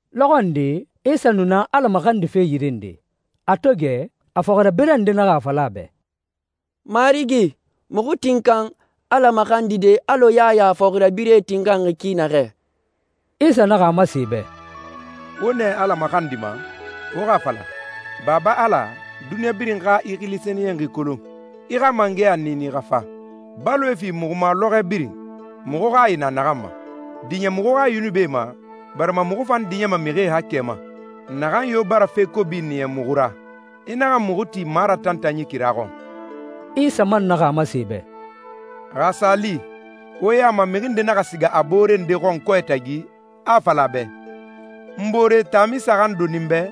Lɔxɔ nde, Isa nu na Ala maxandife yire nde. A to gɛ, a fɔxirabirɛ nde naxa a fala a bɛ, «Marigi, muxu tinkan Ala maxandide alɔ Yaya a fɔxirabirɛe tinkanxi ki naxɛ.» Isa naxa a masen e bɛ, «Wo nɛ Ala maxandima, wo xa a fala, ‹Baba Ala, duniɲa birin xa i xili sɛniyɛnxi kolon. I xa mangɛya niini xa fa. Baloe fi muxu ma lɔxɔɛ birin, muxu hayi na naxan ma. Diɲɛ muxu xa yunubie ma, barima muxu fan diɲɛma mixie haakɛ ma, naxan yo bara fe kobi niya muxu ra. I naxa muxu ti maratantanyi kira xɔn.›» Isa man naxa a masen e bɛ, «Xa a sa li, wo ya ma mixi nde naxa siga a boore nde xɔn kɔɛ tagi, a a fala a bɛ, ‹N boore, taami saxan doni n bɛ,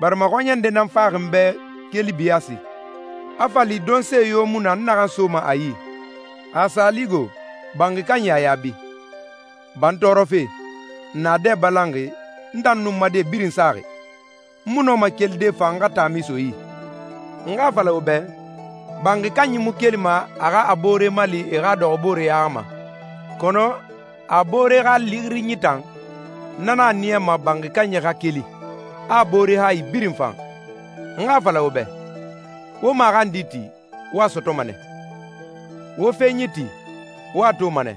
barima xɔɲɛ nde nan faxi n bɛ keli biyaasi, a fa li donse yo mu na n naxan soma a yi.›» «Xa a sa li go, banxi kanyi a yaabi, ‹Ba n tɔɔrɔfe! Naadɛ balanxi, n tan nun n ma die birin saxi. N mu nɔma kelide fa n xa taami so i yi!› N xa a fala wo bɛ, banxi kanyi mu kelima a xa a boore mali e xa dɔxɔbooreya ma. Kɔnɔ a boore xa lixirinyi tan, na nan a niyama banxi kanyi xa keli, a a boore hayi birin fan.» «N xa a fala wo bɛ, wo maxandi ti, wo a sɔtɔma nɛ. Wo fenyi ti, wo a toma nɛ.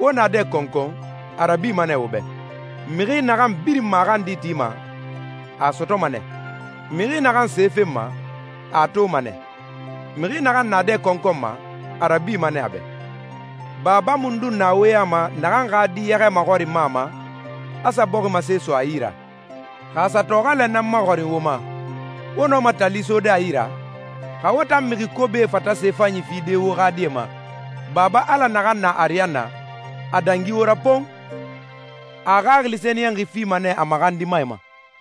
Wo naadɛ kɔnkɔn, a rabima nɛ wo bɛ. Mixi naxan birin maxandi tima, a a sɔtɔma nɛ. Mixi naxan se fenma, a a toma nɛ. Mixi naxan naadɛ kɔnkɔnma, a rabima nɛ a bɛ.» «Baba mundun na wo ya ma naxan xa di yɛxɛ maxɔrinma a ma, a sa bɔximase so a yi ra? Xa a sa tɔxɛlɛ nan maxɔrin wo ma, wo nɔma tali sode a yi ra? Xa wo tan mixi kobie fata se fanyie fide wo xa die ma, Baba Ala naxan na ariyanna, a dangi wo ra pon! A a Xaxili Sɛniyɛnxi fima nɛ a maxandimae ma.»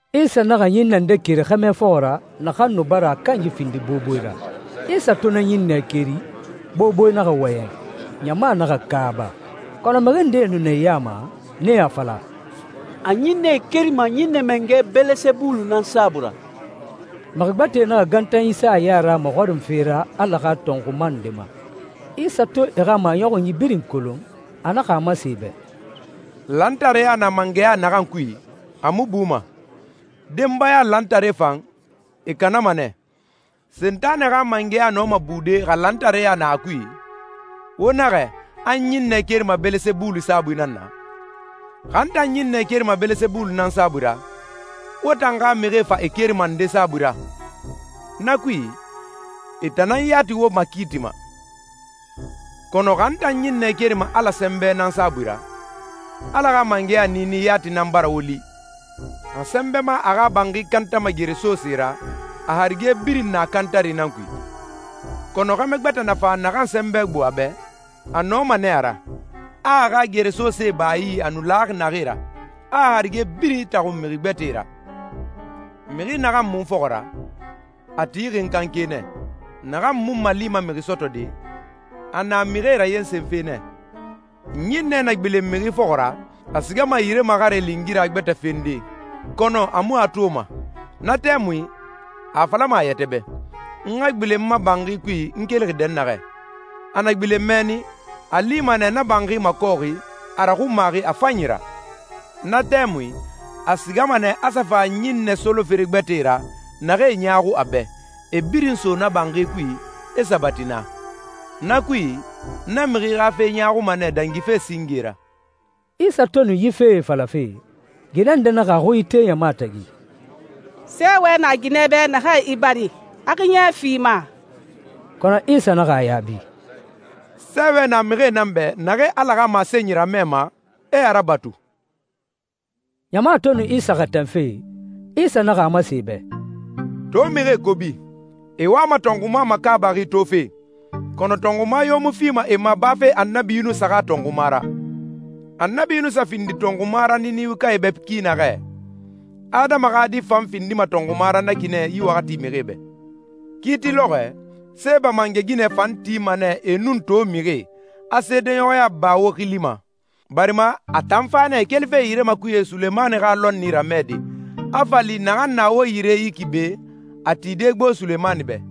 Isa naxa ɲinnɛ nde keri xɛmɛ fɔxɔ ra naxan nu bara a kanyi findi boboe ra. Isa to na ɲinnɛ keri, boboe naxa wɔyɛn, ɲama naxa kaaba. Kɔnɔ mixi ndee nu na e ya ma, nee a fala, «A ɲinnɛe kerima ɲinnɛ mangɛ Bɛlɛsɛbulu nan saabui ra.» Mixi gbɛtɛe naxa gantanyi sa a ya ra a maxɔrinfe ra Ala xa tɔnxuma nde ma. Isa to e xa maɲɔxunyi birin kolon, a naxa a masen e bɛ, «Lantareya na mangɛya naxan kui, a mu buma. Denbaya lantaree fan, e kanama nɛ. Sentanɛ xa mangɛya nɔma bude xa lantareya na a kui? Wo naxɛ a n ɲinnɛ kerima Bɛlɛsɛbulu saabui nan na. Xa n tan ɲinnɛe kerima Bɛlɛsɛbulu nan saabui ra, wo tan xa mixie fa e kerima nde saabui ra? Na kui, e tan nan yati wo makiitima. Kɔnɔ xa n tan ɲinnɛ kerima Ala sɛnbɛ nan saabui ra, Ala xa mangɛya niini yati nan bara wo li.» «Xa sɛnbɛma a xa banxi kantama geresose ra, a harige birin na kantari nan kui. Kɔnɔ xɛmɛ gbɛtɛ na fa naxan sɛnbɛ gbo a bɛ, a nɔma nɛ a ra, a a xa geresosee ba a yi a nu laxi naxee ra, a a harige birin itaxun mixi gbɛtɛe ra.» «Mixi naxan mu n fɔxɔ ra, a tixi n kanke nɛ. Naxan mu n malima mixi sɔtɔde, a na mixie rayensenfe nɛ.» «Ɲinnɛ na gbilen mixi fɔxɔ ra, a sigama yire maxare lingira gbɛtɛ fende, kɔnɔ a mu a toma. Na tɛmui a a falama a yɛtɛ bɛ, ‹N xa gbilen n ma banxi kui n kelixi dɛnnaxɛ.› A na gbilen mɛnni, a a lima nɛ na banxi makɔxi, a raxunmaxi a fanyi ra. Na tɛmui, a sigama nɛ a sa fa ɲinnɛ solofere gbɛtɛe ra naxee ɲaaxu a bɛ, e birin so na banxi kui, e sabati naa. Na kui, na mixi xa fe ɲaaxuma nɛ dangife singe ra.» Isa to nu yi fee falafe, ginɛ nde naxa a xui ite ɲama tagi, «Sɛɛwɛ na ginɛ bɛ naxan i bari, a xiɲɛ fi i ma!» Kɔnɔ Isa naxa a yaabi, «Sɛɛwɛ na mixie nan bɛ naxee Ala xa masenyi ramɛma, e a rabatu.» Ɲama to nu Isa xɛtɛnfe, Isa naxa a masen e bɛ, «To mixie kobi. E wama tɔnxuma makaabaxi tofe, kɔnɔ tɔnxuma yo mu fima e ma bafe Annabi Yunusa xa tɔnxuma ra. Annabi Yunusa findi tɔnxuma ra Ninewekae bɛ ki naxɛ, Adama xa Di fan findima tɔnxuma ra na ki nɛ yi waxati mixie bɛ. Kiiti lɔxɔɛ, Seeba mangɛ ginɛ fan tima nɛ e nun to mixie, a seedeɲɔxɔya ba wo xili ma, barima a tan fa nɛ kelife yire makuye Sulemani xa lɔnni ramɛde, a fa li naxan na wo yire yi ki be, a tide gbo Sulemani bɛ.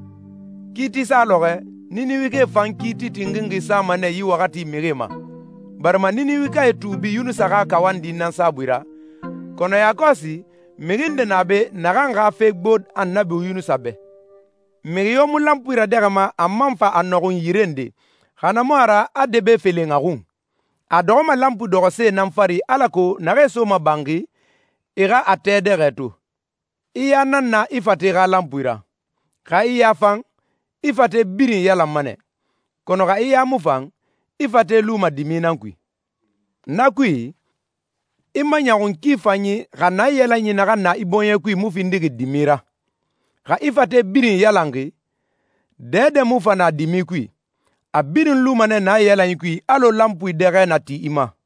Kiiti sa lɔxɔɛ, Ninewekae fan kiiti tinxinxi sama nɛ yi waxati mixie ma, barima Ninewekae tuubi Yunusa xa kawandi nan saabui ra, kɔnɔ yakɔsi mixi nde na be naxan xa fe gbo Annabi Yunusa bɛ.» «Mixi yo mu lanpui radɛxɛma a man fa a nɔxun yire nde, xa na mu a ra a debe felen a xun. A a dɔxɔma lanpui dɔxɔse nan fari alako naxee soma banxi, e xa a tɛ dɛxɛ to.» «I ya nan na i fate xa lanpui ra. Xa i ya fan, i fate birin iyalanma nɛ, kɔnɔ xa i ya mu fan, i fate luma dimi nan kui. Na kui, i maɲɔxun ki fanyi xa naiyalanyi naxan na i bɔɲɛ kui mu findixi dimi ra. Xa i fate birin iyalanxi, dɛdɛ mu fa na dimi kui, a birin luma nɛ naiyalanyi kui alɔ lanpui dɛxɛ na ti i ma.»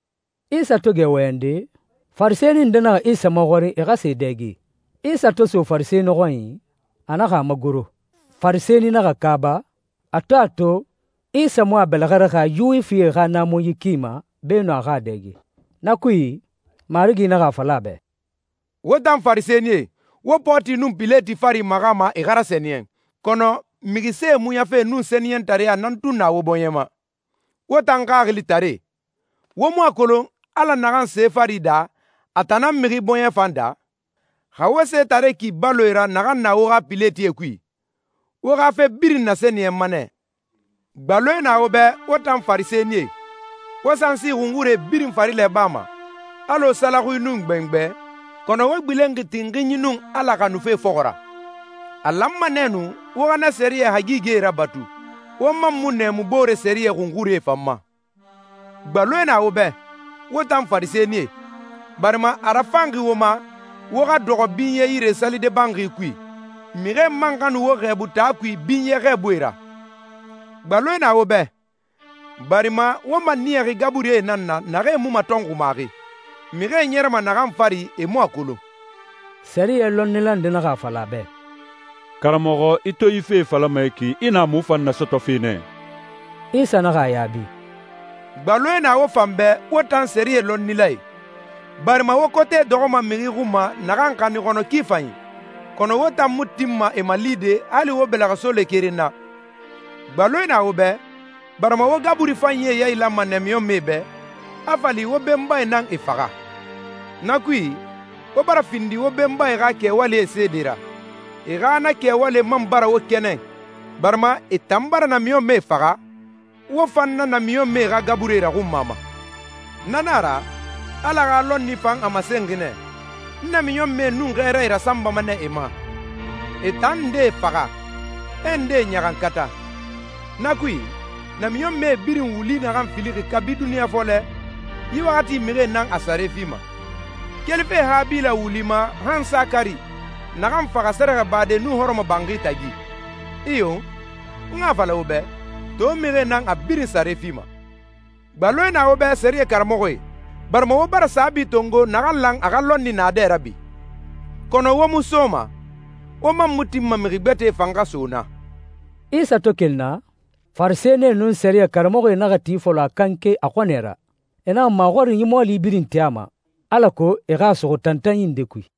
Isa to gɛ wɔyɛnde, Farisɛni nde naxa Isa maxɔrin e xa sa e dɛge. Isa to so Farisɛni xɔnyi, a naxa a magoro. Farisɛni naxa kaaba, a to a to Isa mu a bɛlɛxɛ raxa Yuwifie xa naamunyi ki ma beenun a xa a dɛge. Na kui, Marigi naxa a fala a bɛ, «Wo tan Farisɛnie, wo pɔɔti nun pileti fari maxama e xa rasɛniyɛn, kɔnɔ mixi see muɲafe nun sɛniyɛntareɲa nan tun na wo bɔɲɛ ma. Wo tan xaxilitaree! Wo mu a kolon Ala naxan se fari daa, a tan nan mixi bɔɲɛ fan daa? Xa wo setare ki baloe ra naxan na wo xa piletie kui, wo xa fe birin nasɛniyɛnma nɛ.» «Gbaloe na wo bɛ, wo tan Farisɛnie! Wo sansi xunxurie birin farilɛ bama, alɔ salaxui nun gbɛngbɛ, kɔnɔ wo gbilenxi tinxinyi nun Ala xanufe fɔxɔ ra. A lanma nɛ nu wo xa na sɛriyɛ hagigɛe rabatu, wo man mu nɛɛmu boore sɛriyɛ xunxurie fan ma. Gbaloe na wo bɛ, wo tan Farisɛnie! Barima a rafanxi wo ma, wo xa dɔxɔ binyɛ yire salide banxi kui, mixie man xa nu wo xɛɛbu taa kui binyɛ xɛɛbuie ra. Gbaloe na wo bɛ, barima wo maniyaxi gaburie nan na naxee mu matɔnxumaxi, mixie ɲɛrɛma naxan fari e mu a kolon!» Sɛriyɛ lɔnnila nde naxa a fala a bɛ, «Karamɔxɔ, i to yi fee falama yi ki, i na muxu fan nasɔtɔfe nɛ.» Isa naxa a yaabi, «Gbaloe na wo fan bɛ, wo tan sɛriyɛ lɔnnilae! Barima wo kote dɔxɔma mixi xun ma naxan xanin xɔnɔ ki fanyi, kɔnɔ wo tan mu tinma e malide hali wo bɛlɛxɛsole keren na. Gbaloe na wo bɛ, barima wo gaburi fanyie yailanma namiɲɔnmɛe bɛ, a fa li wo benbae nan e faxa! Na kui, wo bara findi wo benbae xa kɛwalie seede ra, e xa na kɛwalie man bara wo kɛnɛn, barima e tan bara namiɲɔnmɛe faxa, wo fan na namiɲɔnmɛe xa gaburie raxunmama. Na nan a ra, Ala xa lɔnni fan a masenxi nɛ, ‹N namiɲɔnmɛe nun xɛɛrae rasanbama nɛ e ma, e tan ndee faxa, e ndee ɲaxankata.› Na kui, namiɲɔnmɛe birin wuli naxan filixi kabi duniɲa fɔlɛ, yi waxati mixie nan a sare fima, kelife Habila wuli ma han Sakari, naxan faxa sɛrɛxɛbade nun hɔrɔmɔbanxi tagi. Iyo, n xa a fala wo bɛ, to mixie nan a birin sare fima. Gbaloe na wo bɛ sɛriyɛ karamɔxɔe, barima wo bara saabi tongo naxan lan a xa lɔnni naadɛ rabi. Kɔnɔ wo mu soma, wo man mu tinma mixi gbɛtɛ fan xa so naa.» Isa to keli naa, Farisɛnie nun sɛriyɛ karamɔxɔe naxa ti fɔlɔ a kanke a xɔnɛ ra. E naxa maxɔrinyi mɔɔli birin ti a ma, alako e xa a suxu tantanyi nde kui.